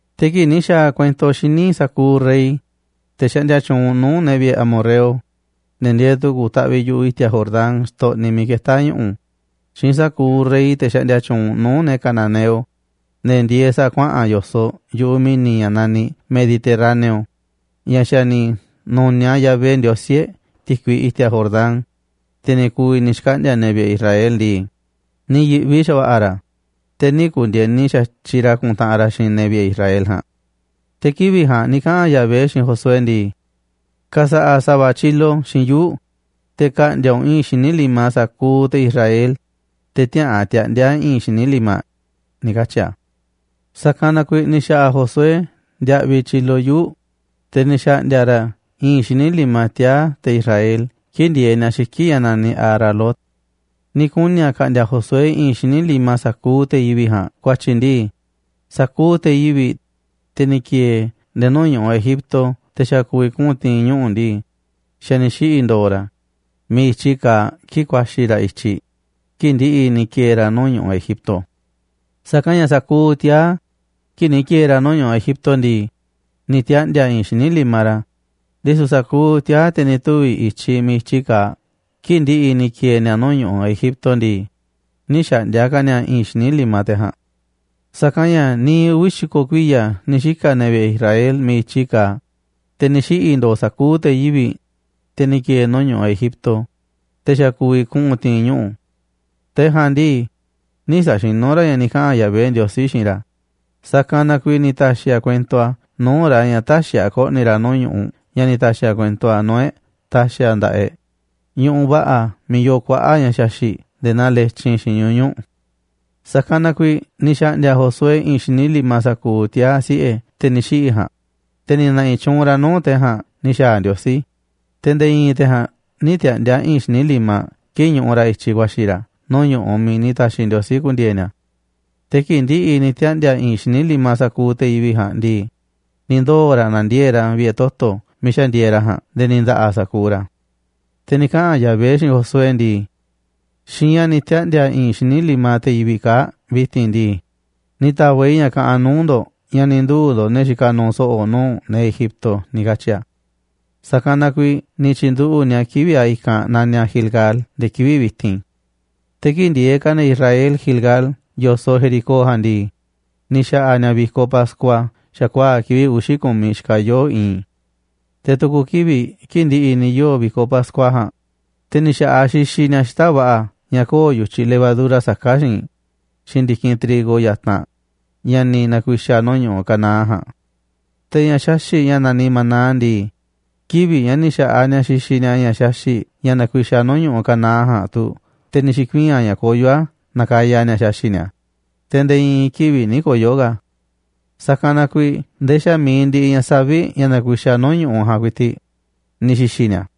Te̱ kii̱ꞌ ni̱ xa̱a̱ kuento xíniꞌ sa̱kuuꞌ rey, te̱ xaꞌndia tyuunꞌ nuu̱ꞌ ne̱ vi̱ꞌe̱ amorreo, ne̱ ndieeꞌ tu̱ku̱ taꞌviꞌ yu̱ꞌuꞌ i̱ti̱a̱ Jordán xtoꞌniꞌ miiꞌ ketá ñu̱ꞌu̱, xiinꞌ sa̱kuuꞌ rey, te̱ xaꞌndia tyuunꞌ nuu̱ꞌ ne̱ cananeo, ne̱ ndieeꞌ sa̱a̱ kuaꞌa̱n yo̱soꞌ yu̱ꞌuꞌ mi̱ni̱ ña̱ naniꞌ Mediterráneo, ña̱ xa̱ ni̱ nu̱niaꞌ Yahvé Ndiosí e̱ꞌ ti̱kui i̱ti̱a̱ Jordán, te̱ ni̱ ku̱vi̱ ni̱ xkaꞌndi̱a̱ ne̱ vi̱ꞌe̱ Israel ndii, ni̱ yi̱ꞌvi xa̱va̱ꞌa̱ ra̱, te̱ nï̱ ku̱ndi̱e̱ni xa̱tyiꞌ ra̱ ku̱ntaꞌanꞌ ra̱ xiinꞌ ne̱ vi̱ꞌe̱ Israel ja̱a̱nꞌ. Te̱ kivi̱ꞌ ja̱a̱nꞌ ni̱ kaꞌa̱n Yahvé xiinꞌ Josué ndii: ―Ka̱sa̱ꞌa̱ sa̱va̱ tyilo xiinꞌ yuu̱ꞌ, te̱ ka̱ꞌndi̱a̱ u̱nꞌ i̱i̱nꞌ xíniꞌ limaꞌ sa̱kuuꞌ te̱ Israel, te̱ tiäꞌa̱an tiaꞌndi̱a̱ i̱i̱n xíniꞌ limaꞌ ―ni̱ katyi̱ a̱. Sa̱kanꞌ na kuiiꞌ ni̱ xa̱ꞌa̱ Josué ndiaꞌviꞌ tyilo yuu̱ꞌ, te̱ ni̱ xa̱ꞌndi̱a̱ ra̱ i̱i̱nꞌ xíniꞌ limaꞌ tiaa̱ te̱ Israel kii̱ꞌ ndieeꞌ ni̱a̱ xiki̱ꞌ ña̱ naniꞌ Aralot. Ni̱ kuni̱ a̱ ka̱ꞌndi̱a̱ Josué i̱i̱nꞌ xíniꞌ limaꞌ sa̱kuuꞌ te̱ yivi̱ꞌ ja̱a̱nꞌ ku̱a̱tyi̱ ndii, sa̱kuuꞌ te̱ yivi̱ꞌ, te̱ ni̱ ki̱e̱e̱ nde̱e̱ nuu̱ꞌ ñu̱ꞌuꞌ Egipto te̱ xa̱ ku̱vi̱ kuꞌu̱n ti̱i̱n ñuꞌu̱ ndii, xa̱ ni̱ xiꞌi̱ ndo̱o̱ ra̱ miiꞌ i̱tyiꞌ kaaꞌ kii̱ꞌ ku̱a̱xi̱ ra̱ i̱tyiꞌ kii̱ꞌ ndi̱ꞌi̱ ni̱ ki̱e̱e̱ ra̱ nuu̱ꞌ ñu̱ꞌuꞌ Egipto. Sa̱kanꞌ ña̱ sa̱kuuꞌ tiaa̱, kii̱ꞌ ni̱ ki̱e̱e̱ ra̱ nuu̱ꞌ ñu̱ꞌuꞌ Egipto ndii, ni̱ tiaꞌndi̱a̱ i̱i̱n xíniꞌ limaꞌ ra̱, ndisu̱ sa̱kuuꞌ tiaa̱, te̱ ni̱ tuvi̱ i̱tyiꞌ miiꞌ i̱tyiꞌ kaaꞌ kii̱ꞌ ndi̱ꞌi̱ ni̱ ki̱e̱e̱ ni̱a̱ nuu̱ꞌ ñu̱ꞌuꞌ Egipto ndii, nï̱ xa̱ꞌndi̱a̱ ka̱ ni̱a̱ i̱i̱nꞌ xíniꞌ limaꞌ te̱ ja̱a̱nꞌ. Sa̱kanꞌ ña̱ niiꞌ uvi̱ xi̱ko̱ kuiya̱ ni̱ xika̱ ne̱ vi̱ꞌe̱ Israel miiꞌ i̱tyiꞌ kaaꞌ, te̱ ni̱ xiꞌi̱ ndo̱o̱ sa̱kuuꞌ te̱ yivi̱ꞌ, te̱ ni̱ ki̱e̱e̱ nuu̱ꞌ ñu̱ꞌuꞌ Egipto, te̱ xa̱ ku̱vi̱ kuꞌu̱n ti̱i̱n ñuꞌu̱. Te̱ ja̱a̱nꞌ ndii, nï̱ sa̱xinú ra̱ ña̱ ni̱ kaꞌa̱n Yahvé Ndiosí xiinꞌ ra̱, sa̱kanꞌ na kuiiꞌ ni̱ ta̱xi̱ a̱ kuento nuu̱ꞌ ra̱ ña̱ tä̱xi̱ a̱ ko̱ꞌni̱ ra̱ nuu̱ꞌ ñu̱ꞌuꞌ ña̱ ni̱ ta̱xi̱ a̱ kuento a̱ nuu̱ꞌ e̱ꞌ ta̱xi̱ a̱ nda̱ꞌaꞌ e̱ꞌ ñu̱ꞌuꞌ va̱ꞌa̱ miiꞌ yoo kuaꞌa̱ꞌ ña̱ xaxi̱ꞌ nde̱e̱ naa letyin xiinꞌ ñuñu̱ꞌ. Sa̱kanꞌ na kuiiꞌ ni̱ xa̱ꞌndi̱a̱ Josué i̱i̱nꞌ xíniꞌ limaꞌ sa̱kuuꞌ tiaa̱ siꞌe̱ te̱ ni̱ xiꞌi̱ ja̱a̱nꞌ, te̱ ni̱ na̱ꞌi̱ tyuunꞌ ra̱ nuu̱ꞌ te̱ ja̱a̱nꞌ ni̱ xa̱a̱ Ndiosí, te̱ nde̱e̱ i̱i̱n te̱ ja̱a̱nꞌ nï̱ tiaꞌndi̱a̱ i̱i̱nꞌ xíniꞌ limaꞌ kii̱ꞌ ñuꞌuꞌ ra̱ i̱tyiꞌ ku̱a̱xi̱ ra̱ nuu̱ꞌ ñu̱ꞌuꞌ miiꞌ ni̱ ta̱xi̱ Ndiosí ku̱ndi̱e̱e̱ ni̱a̱. Te̱ kii̱ꞌ ndi̱ꞌi̱ ni̱ tiaꞌndi̱a̱ i̱i̱nꞌ xíniꞌ limaꞌ sa̱kuuꞌ te̱ yivi̱ꞌ ja̱a̱nꞌ ndii, ni̱ ndoo̱ ra̱ na̱ndiee̱ꞌ ra̱ vi̱ꞌe̱ toto̱ miiꞌ xa̱ ndieeꞌ ra̱ ja̱a̱nꞌ nde̱e̱ ni̱ nda̱ꞌa̱ sa̱kuuꞌ ra̱. Te̱ ni̱ kaꞌa̱n Yahvé xiinꞌ Josué ndii: ―Xiinꞌ ña̱ ni̱ tiaꞌndi̱a̱ i̱i̱nꞌ xíniꞌ limaꞌ te̱ yivi̱ꞌ kaa̱ꞌ vi̱ti̱n ndii, ni̱ ta̱va̱ꞌ i̱ ña̱ kaꞌanꞌ nuu̱ꞌ ndo̱ꞌ ña̱ ni̱ nduu̱ ndo̱ꞌ ne̱ ni̱ xika̱ nu̱u̱ so̱ꞌo̱ nuu̱ꞌ ne̱ Egipto ―ni̱ katyi̱ a̱. Sa̱kanꞌ na kuiiꞌ ni̱ tyi̱nduꞌu̱ꞌ ni̱a̱ kivi̱ꞌ a̱ i̱kanꞌ naniꞌ a̱ Gilgal nde̱e̱ kivi̱ꞌ vi̱ti̱n. Te̱ kii̱ꞌ ndieeꞌ ka̱ ne̱ Israel Gilgal yo̱soꞌ Jericó ja̱a̱nꞌ ndii, ni̱ xa̱ꞌa̱ ni̱a̱ vi̱koꞌ pascua xa̱kuaa̱ꞌ kivi̱ꞌ uxi̱ ku̱miꞌ xikaꞌ yooꞌ i̱i̱n. Te̱ tu̱ku̱ kivi̱ꞌ kii̱ꞌ ndi̱ꞌi̱ ni̱ yoo̱ vi̱koꞌ pascua ja̱a̱nꞌ, te̱ ni̱ xa̱ꞌaꞌ xixiꞌ ni̱a̱ xita̱ꞌ va̱ꞌa̱ ña̱ köo̱ꞌ yu̱tyiꞌ levadura saká xiinꞌ, xiinꞌ ndi̱kinꞌ trigo yatanꞌ ña̱ ni̱ na̱ku̱i̱xa̱ nuu̱ꞌ ñu̱ꞌuꞌ Canaán ja̱a̱nꞌ. Te̱ ña̱ xaxi̱ꞌ ña̱ naniꞌ maná ndii, kivi̱ꞌ ña̱ ni̱ xa̱ꞌaꞌ ni̱a̱ xixiꞌ ni̱a̱ ña̱ xaxi̱ꞌ ña̱ nakuixaꞌ nuu̱ꞌ ñu̱ꞌuꞌ Canaán ja̱a̱nꞌ tu̱ te̱ ni̱ xi̱kuii̱n a̱ ña̱ koyó a̱ nakaya ni̱a̱ xaxi̱ꞌ ni̱a̱, te̱ nde̱e̱ i̱i̱n kivi̱ꞌ nï̱ koyo̱ ka̱ a̱. Sa̱kanꞌ na kuiiꞌ ndee xa̱ mi̱iꞌ ndiꞌiꞌ ña̱ savi̱ꞌ, ña̱ nakuixaꞌ nuu̱ꞌ ñu̱ꞌuꞌ ja̱a̱nꞌ ku̱i̱ti̱ꞌ, ni̱ xi̱xi̱ ni̱a̱.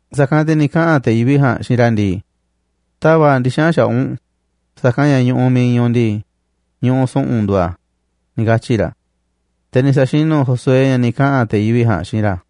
Sa̱kanꞌ te̱ ni̱ kaꞌa̱n te̱ yivi̱ꞌ ja̱a̱nꞌ xiinꞌ ra̱ ndii: ―Ta̱va̱ꞌ ndixa̱nꞌ xaꞌa̱ꞌ u̱nꞌ, sa̱kanꞌ ña̱ ñu̱ꞌuꞌ miiꞌ iinꞌ u̱nꞌ ndii, ñu̱ꞌuꞌ su̱ꞌu̱n nduuꞌ a̱ ―ni̱ katyi̱ ra̱. Te̱ ni̱ sa̱xinu̱ Josué ña̱ ni̱ kaꞌa̱n te̱ yivi̱ꞌ ja̱a̱nꞌ xiinꞌ ra̱.